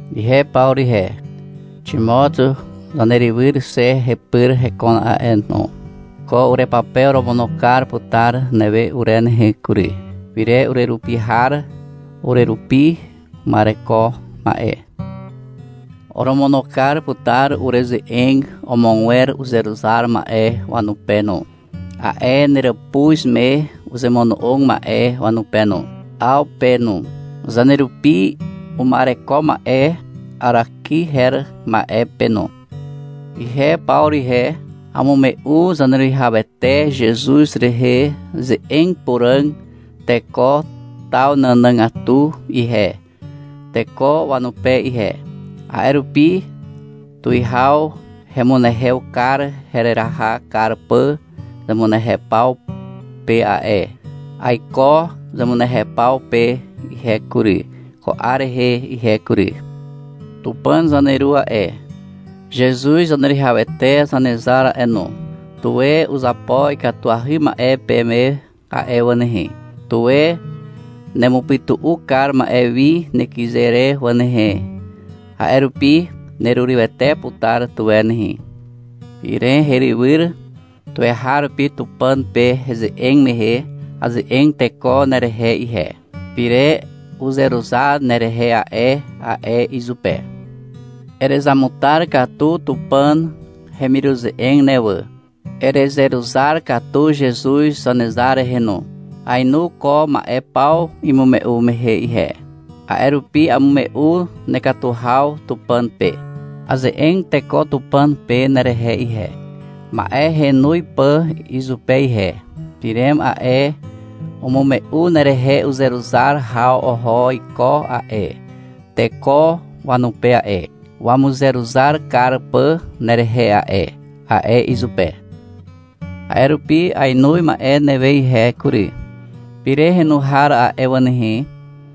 Ihe Pawru ihe, Ximot zanerywyr xe hepyr hekon a'e no. Ko urepape oromono kar putar newe ure nehe kury, Pirem, urerapi har, urerupi uma'ereko ma'e. Oromono kar putar ureze'eg amogwer uzeruzar ma'e wanupe no, a'e neràpuz me uzemono'og ma'e wanupe no, Aw pe no, zanerupi uma'ereko ma'e Araki her ma'e pe no. Ihe Pawru ihe, amume'u Zaneruwihawete Zezuz rehe ze'eg puràg teko taw nànàgatu ihe, teko wanupe ihe. A'e rupi tuwihaw hemunehew kar hereraha kar pà zemunehew paw pe a'e. Aiko zemunehew paw pe ihe kury, ko 'ar rehe ihe kury. Tupàn zaneru a'e, Zezuz Zaneruwihawete Zanezar a'e no, tuwe uzapo ikatuahy ma'e peme a'e wà nehe. Tuwe nemupytu'u kar ma'e wi nekyze re wà nehe. A'e rupi nerurywete putar tuwe nehe. Pirem herywyr, tuweharupi Tupàn pe heze'eg mehe, aze'eg teko nerehe ihe. — Pirem uzeruzar nerehe a'e, a'e izupe. Erezamutar katu Tupàn hemiruze'eg ne wà, erezeruzar katu Zezuz Zanezar rehe no. Aenu ko ma'e paw imume'u mehe ihe. A'e rupi amume'u nekatu haw Tupàn pe. Aze'eg teko Tupàn pe nerehe ihe, ma'e henoz pà izupe ihe. — Pirem a'e, umume'u nerehe uzeruzar haw oho iko a'e, teko wanupe a'e, wamuzeruzar kar pà nerehe a'e, a'e izupe. — A'e rupi ainoz ma'e newe ihe kury. Pirem henu har a'e wà nehe,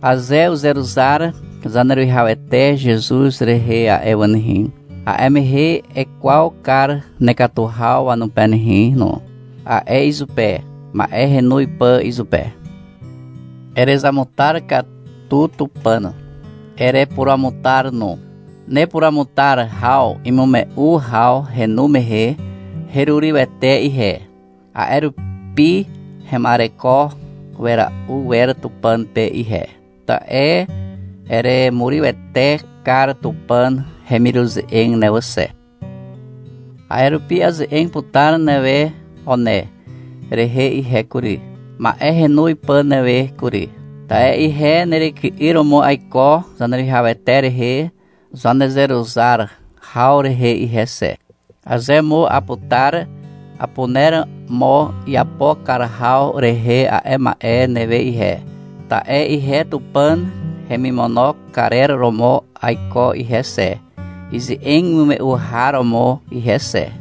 aze uzeruzar Zaneruwihawete Zezuz rehe a'e wà nehe, a'e mehe ekwaw kar nekatu haw wanupe nehe no, a'e izupe, ma'e henoz pà izupe. Erezamutar katu Tupàn. Erepuruamutar no. Nepuruamutar haw imume'u haw henu mehe, herurywete ihe. A'e rupi hema'ereko wera'u wer Tupàn pe ihe. Ta'e eremurywete kar Tupàn hemiruze'eg ne wà xe. A'e rupi aze'eg putar newe One rehe ihe kury, ma'e henoz pà newe kury. Ta'e ihe neryky'yr romo aiko Zaneruwihawete rehe zanezeruzar haw rehe ihe xe. Aze mo aputar, apuner mo iapo kar haw rehe a'e ma'e newe ihe, ta'e ihe Tupàn hemimono karer romo aiko ihe xe, ize'eg imume'u har romo ihe xe.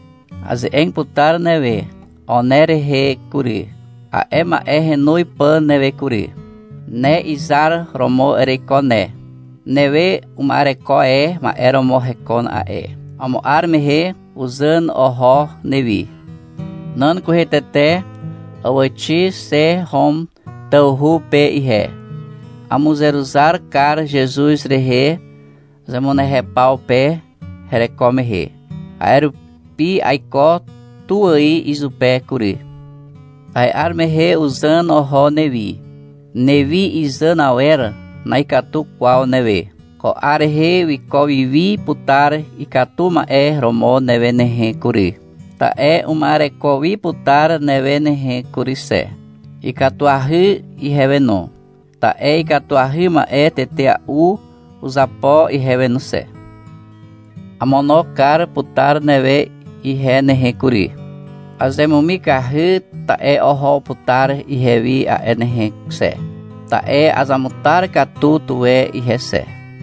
Aze'eg putar newe One rehe kury, a'e ma'e henoz pà newe kury. Ne izar romo ereiko ne. Newe uma'ereko e ma'e romo hekon a'e. Amo 'ar mehe uzàn oho newi. Nan kwehe tete àwàxi xe Hom tawhu pe ihe. Amuzeruzar kar Zezuz rehe, zemunehew paw pe hereko mehe. A'e rupi aiko tu ài izupe kury. A'e 'ar mehe uzàn oho newi. Newi izàn awer na'ikatu kwaw newe. Ko 'ar rehe wiko wiwi putar ikatu ma'e romo newe nehe kury, ta'e uma'ereko wi putar newe nehe kury xe. Ikatuahy ihewe no. Ta'e ikatuahy ma'e tetea'u uzapo ihewe no xe. Amono kar putar newe ihe nehe kury. Azemumikahy ta'e oho putar ihewi a'e nehe xe, ta'e azamutar katu tuwe ihe xe.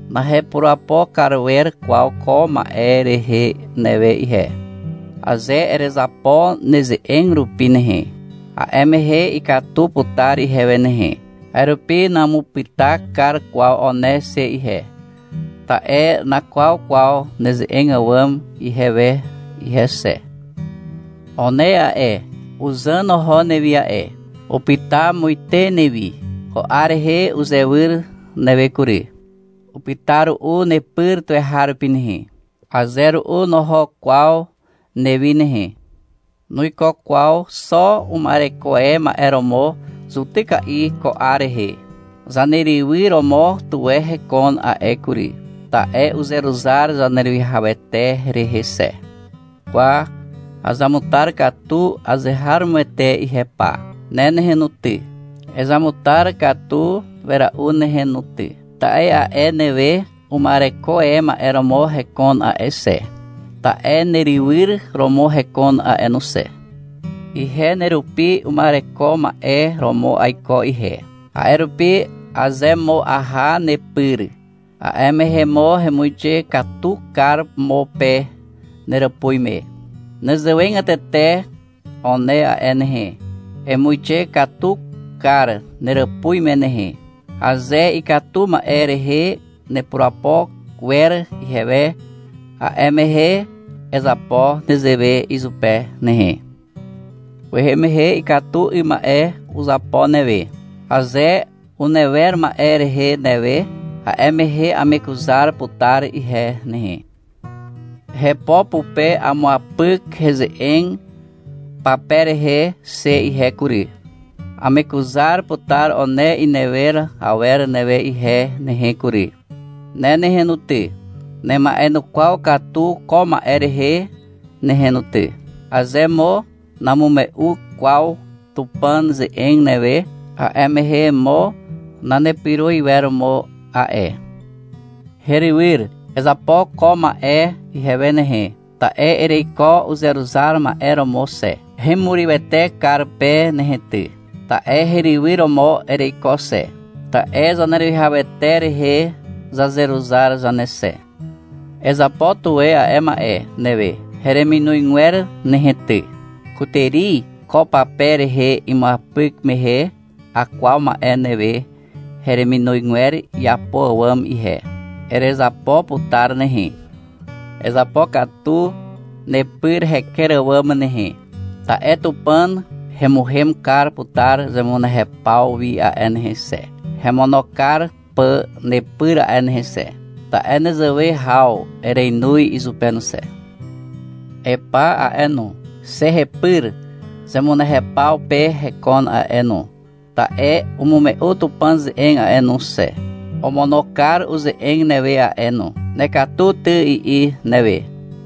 Nahepurapo kar wer kwaw ko ma'e rehe newe ihe. Aze erezapo neze'eg rupi nehe, a'e mehe ikatu putar ihewe nehe. A'e rupi namupyta kar kwaw One xe ihe. Ta'e nakwaw kwaw neze'eg àwàm ihewe ihe xe. One a'e, uzàn oho newi a'e. Upyta muite newi. Ko 'ar rehe uzewyr newe kury. Upyta ru'u nepyr tuweharupi nehe. Aze ru'u noho kwaw newi nehe. Nuiko kwaw xo uma'ereko e ma'e romo zutyka'i ko 'ar rehe. Zanerywyr romo tuwe hekon a'e kury, ta'e uzeruzar Zaneruwihawete rehe xe. Kwa azamutar katu azeharomoete ihe pa. Ne nehe no ty, ezamutar katu wera'u nehe no ty. Ta'e a'e newe uma'ereko e ma'e romo hekon a'e xe, ta'e nerywyr romo hekon a'e no xe. Ihe nerupi uma'ereko ma'e romo aiko ihe. A'e rupi, aze mo aha nepyr, a'e mehe mo hemuixe katu kar mo pe neràpuz me. Nezewegatete One a'e nehe, emuixe katu kar neràpuz me nehe. Aze ikatu ma'e rehe nepurapo wer ihewe, a'e mehe ezapo nezewe izupe nehe. Kwehe mehe ikatu 'ym ma'e uzapo newe. Aze unewer ma'e rehe newe, a'e mehe amekuzar putar ihe nehe. Hepo pupe amuapyk heze'eg pape rehe xe ihe kury. Amekuzar putar One inewer awer newe ihe nehe kury. Ne nehe no ty, nema'enukwaw katu ko ma'e rehe nehe no ty. Aze mo namume'u kwaw Tupàn ze'eg newe, a'e mehe mo nanepyro iwer mo a'e. Herywyr. Ezapo ko ma'e ihewe nehe, ta'e ereiko uzeruzar ma'e romo xe. Hemurywete kar pe nehe ty, ta'e herywyr romo ereiko xe, ta'e Zaneruwihawete rehe zazeruzar zane xe. Ezapo tuwe a'e ma'e newe hereminozgwer nehe ty. Kutàri, ko pape rehe imuapyk mehe, akwaw ma'e newe hereminozgwer iapo àwàm ihe. Erezapo putar nehe. Ezapokatu nepyr heker àwàm nehe. Ta'e Tupàn hemuhem kar putar zemunehew paw wi a'e nehe xe, hemono kar pà nepyr a'e nehe xe, ta'e nezewe haw erenoz izupe no xe. Epa a'e no, xe hepyr zemunehew paw pe hekon a'e no, ta'e umume'u Tupàn ze'eg a'e no xe. Omono kar uze'eg newe a'e no. — Nekatu ty, i'i newe.